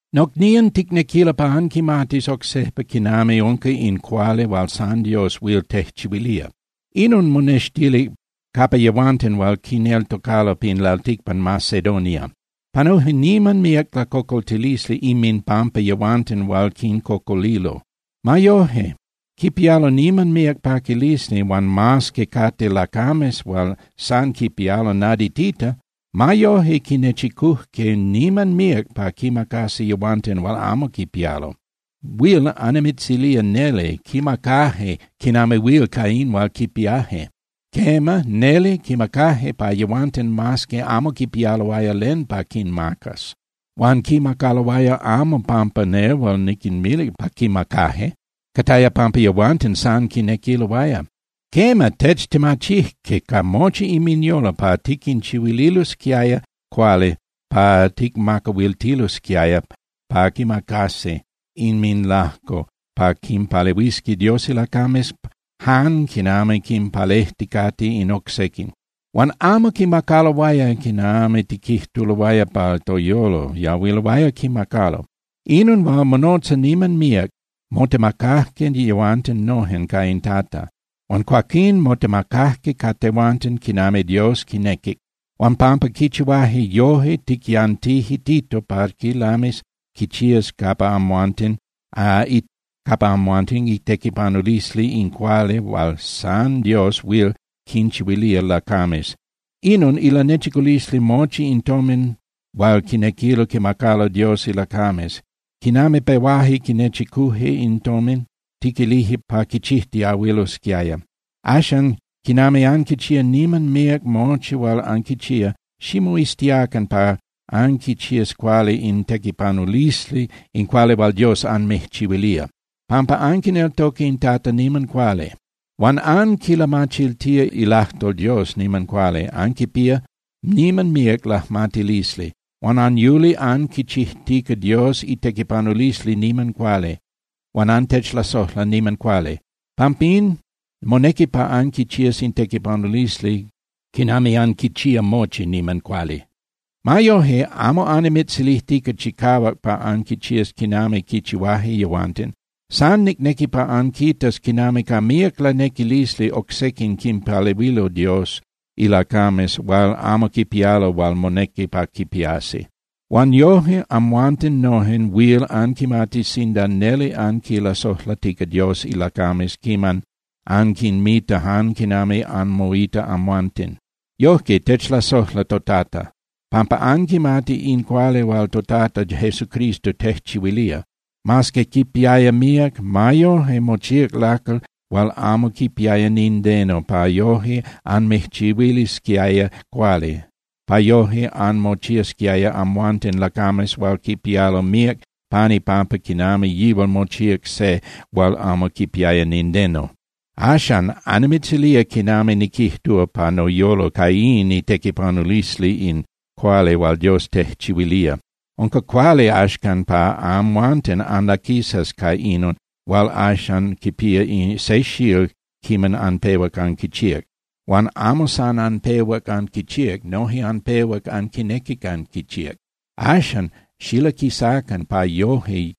Nocnían, ticnequilo pa anquimatis oc sejpa quinami unca in cuali hual san Dios huil tejchihuilía. Inon monextilic capa yehuanten hual quineltocalo pin lalticpan Macedonia. Panuje niman míac lacocoltilisli inminpampa yehuanten hual quincocolilo. Ma yoje quipialo niman míac paquilisli, huan mas que cate lacames hual san quipialo naditita, ma yoje quinechicujque niman míac pa quinmacasi yehuanten hual amo quipialo. Huil annimitzilía neli, quimacaje quinami huil ca in hual quipiaje. Quema, neli quimacaje pa yehuanten mas que amo quipialoaya len pa quinmacas. Huan quimacaloaya amo pampa nehual niquinmilic pa quimacaje. Cataya pampa yehuanten san quinequiloaya. Quema, techtemachijque ca mochi inminyolo pa tiquinchihuililosquiaya cuali pa tiquinmacahuiltilosquiaya pa quimacasi inminlajco pa quimpalehuisqui Dios ilacames jan quinami quimpalejticate in oc sequin. Huan amo quimacaloaya quinami tiquijtuloaya pa toyolo yahuiloaya quimacalo. Inon hual monotza niman míac, motemacajque yehuanten nojen ca in Tata, huan cuaquín motemacajque ca tehuanten quinami Dios quinequic. Huan pampa quichihuaje yoje, tiquiyantije Tito pa quilamis quichías capa amhuanten itequipanulisli in cuali hual san Dios huil quinchihuilía lacames. Inon ilanechiculisli mochi in tomin hual quinequilo quimacalo Dios ilacames. Quinami pehuaje quinechicuje in tomin, tiquilije pa quichijtiahuilosquiaya. Axan, quinami anquichía niman cuali mochi hual anquichía, ximoiztiacan pa anquichías cuali in itequipanulisli in cuali hual Dios anmijchihuilía, pampa anquineltoca in Tata niman cuali. Huan anquilamachiltía ilajtol Dios niman cuali, anquipía niman míac lajmatilisli. Huan anyuli anquichijtica Dios itequipanulisli niman cuali, huan antechlasojla niman cuali. Pampín, monequi pa anquichías in tequipanulisli quinami anquichía mochi niman cuali. Ma yoje, amo annimitzilijtica chicahuac pa anquichías quinami quichihuaje yehuanten. San nicnequi pa anquitas quinami ca míac lanequilisli oc sequin quinpalehuilo Dios ilacames hual amo quipialo hual monequi pa quipiasi. Huan yoje amhuanten noje huil anquimatis sinda neli anquinlasojlatica Dios ilacames quiman anquinmita jan quinami anmoita amhuanten. Yojque techlasojla toTata, pampa anquimati in cuali hual toTata Jesucristo tejchihuilía. Mas que quipiaya míac, ma yoje mochíac lacal hual amo quipiaya nindeno pa yoje anmijchihuilisquiaya cuali, pa yoje anmochiasquiaya amhuanten lacames hual quipialo míac pan ipampa quinami yihual mochíac se hual amo quipiaya nindeno. Axan, annimitzilía quinami niquijtúa pa noyolo ca in itequipanulisli in cuali hual Dios tejchihuilía: Unca cuali axcan pa amhuanten anlaquisas ca inon hual axan quipía se xíl quiman anpehuac anquichíac. Huan amo san anpehuac anquichíac, noje anpehuac anquinequic anquichíac. Axan xilaquisacan pa yoje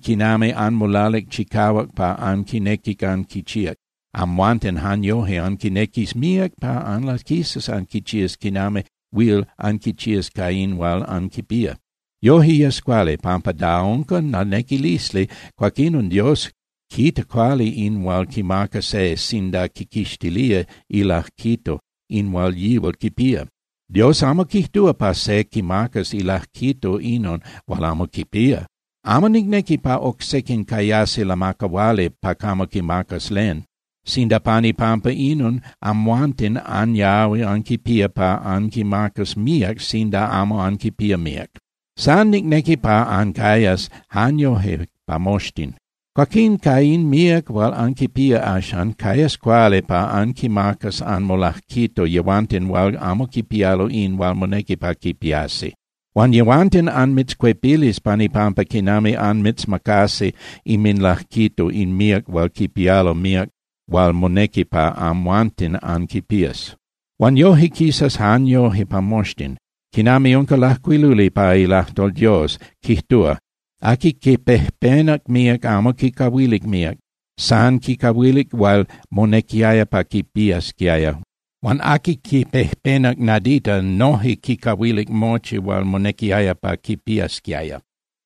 quinami anmolalic chicahuac pa anquinequic anquichíac, amhuanten jan yoje anquinequis míac pa anlaquisas anquichías quinami huil anquichías ca in hual anquipía. Yoje yes cuali, pampa da unca lanequilisli, cuaquinon Dios quita cuali in hual quimaca se sinda quiquixtilía ilajquito in hual yihual quipía. Dios amo quijtúa pa se quimacas ilajquito inon hual amo quipía. Amo nicnequi pa oc sequin cayasi lamacahuali pa camo quimacas len, sinda pan ipampa inon amhuanten anyahui anquipía pa anquimacas míac sinda amo anquipía míac. San nicnequi pa cayas jan yoje pa moxtin. Cuaquín ca in míac hual anquipía axan, cayas cuali pa anquinmacas anmolajquito yehuanten hual amo quipialo in hual monequi pa quipiasi. Huan yehuanten anmitzcuepilis pan ipampa quinami anmitzmacasi inminlajquito in míac hual quipialo míac hual monequi pa amhuanten anquipías. Huan yoje quisas jan yoje pa moxtin. Quinami unca lajcuiluli pa ilajtol Dios, quijtúa: “Aqui quipejpenac míac amo quicahuilic míac. San quicahuilic hual monequiaya pa quipiasquiaya. Huan aqui quipejpenac nadita noje quicahuilic mochi hual monequiaya pa quipiasquiaya.”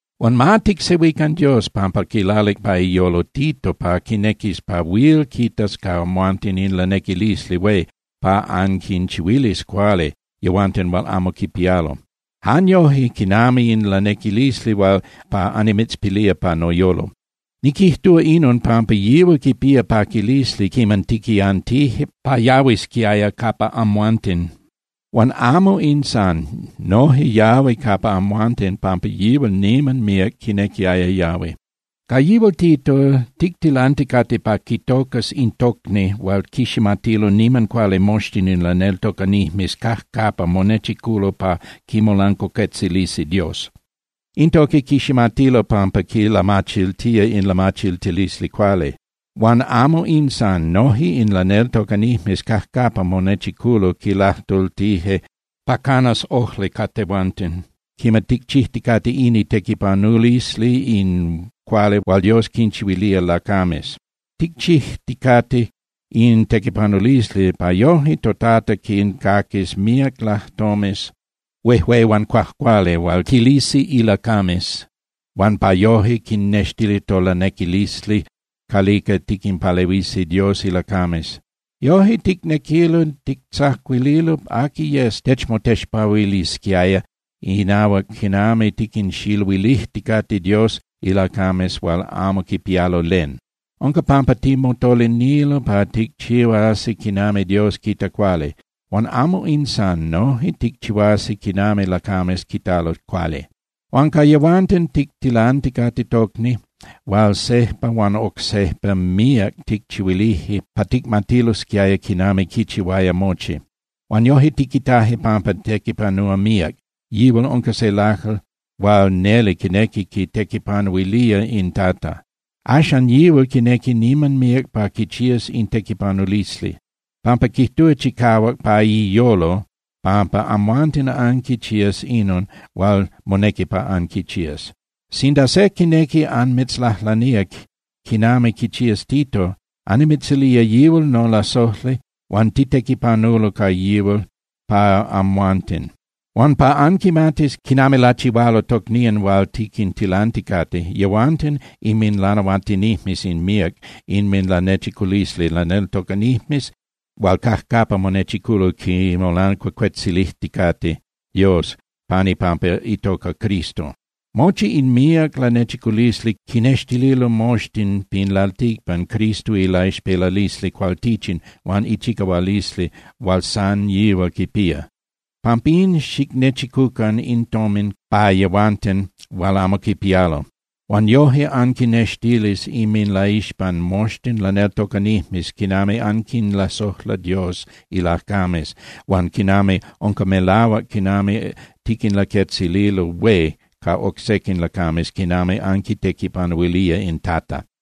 Huan ma ticsehuican Dios pampa quilalic pa iyolo Tito pa quinequis pa huil quitas ca amhuanten in lanequilisli hué pa anquinchihuilis cuali yehuanten hual amo quipialo, jan yoje quinami in lanequilisli hual annimitzpilía pa noyolo. Niquijtúa inon pampa yihual quipiaya paquilisli quiman tiquiyantije pa yahuisquiaya capa amhuanten. Huan amo in san. Noje yahui capa amhuanten pampa yihual niman míac quinequiaya yahui. Ca yihual Tito, tictilanticate pa quitocas in tocni hual quiximatilo niman cuali moxtin in laneltocanijmes cajcapa monechiculo pa quimolancuacuetzilisi Dios. In tocni quiximatilo pampa quilamachiltía in lamachiltilisli cuali. Huan amo in san. Noje in laneltocanijmes cajcapa monechiculo quilajtultije pa canas ojli ca tehuanten quiman ticchijticate in itequipanulisli in cuali hual Dios quinchihuilía lacames. Ticchijticate in tequipanulisli pa yoje toTata quincaquis míac lajtomes huejué huan cuajcuali hual quilisi ilacames, huan pa yoje quinextis tolanequilisli calica tiquinpalehuisi Dios ilacames. Yoje ticnequilo tictzacuililo aqui yes techmotexpahuilisquiaya inahuac quinami tiquinxiluilijticate Dios ilacames hual amo quipialo len. Unca pampa timotolinilo pa ticchihuasi quinami Dios quita cuali. Huan amo in san, noje ticchihuasi quinami lacames quitalo cuali. Huan ca yehuanten tictilanticate tocni hual sejpa huan oc sejpa míac ticchihuilije pa ticmatilosquiaya quinami quichihuaya mochi. Huan yoje tiquitaje pampa tequipanúa míac, yihual unca se lacal hual neli quinequi quitequipanuilía in Tata. Axan yihual quinequi niman míac pa quichías in tequipanulisli, pampa quijtúa chicahuac pa iyolo pampa amhuanten anquichías inon hual monequi pa anquichías. Sinda se quinequi anmitzlajlanía quinami quichías Tito, annimitzilía yihual nolasojli huan titequipanulo ca yihual pa amhuanten. Huan pa anquimatis quinami lachihualo tocnían hual tiquintilanticate, yehuanten inminlanahuatinijmes in míac inminlanechiculisli laneltocanijmes hual cajcapa monechiculo quimolancuacuetzilijticate Dios pan ipampa itoca Cristo. Mochi in míac lanechiculisli quinextililo moxtin pin lalticpan Cristo ilaixpelalisli cualtichin huan ichicahualisli hual san yihual quipía. Pampín xicnechicucan in tomin pa yehuanten hual amo quipialo, huan yoje anquinextilis inminlaixpan moxtin laneltocanijmes quinami anquinlasojla Dios ilacames, huan quinami unca melahuac quinami tiquinlaquetzililo hué ca oc sequin lacames quinami anquitequipanuilía in Tata.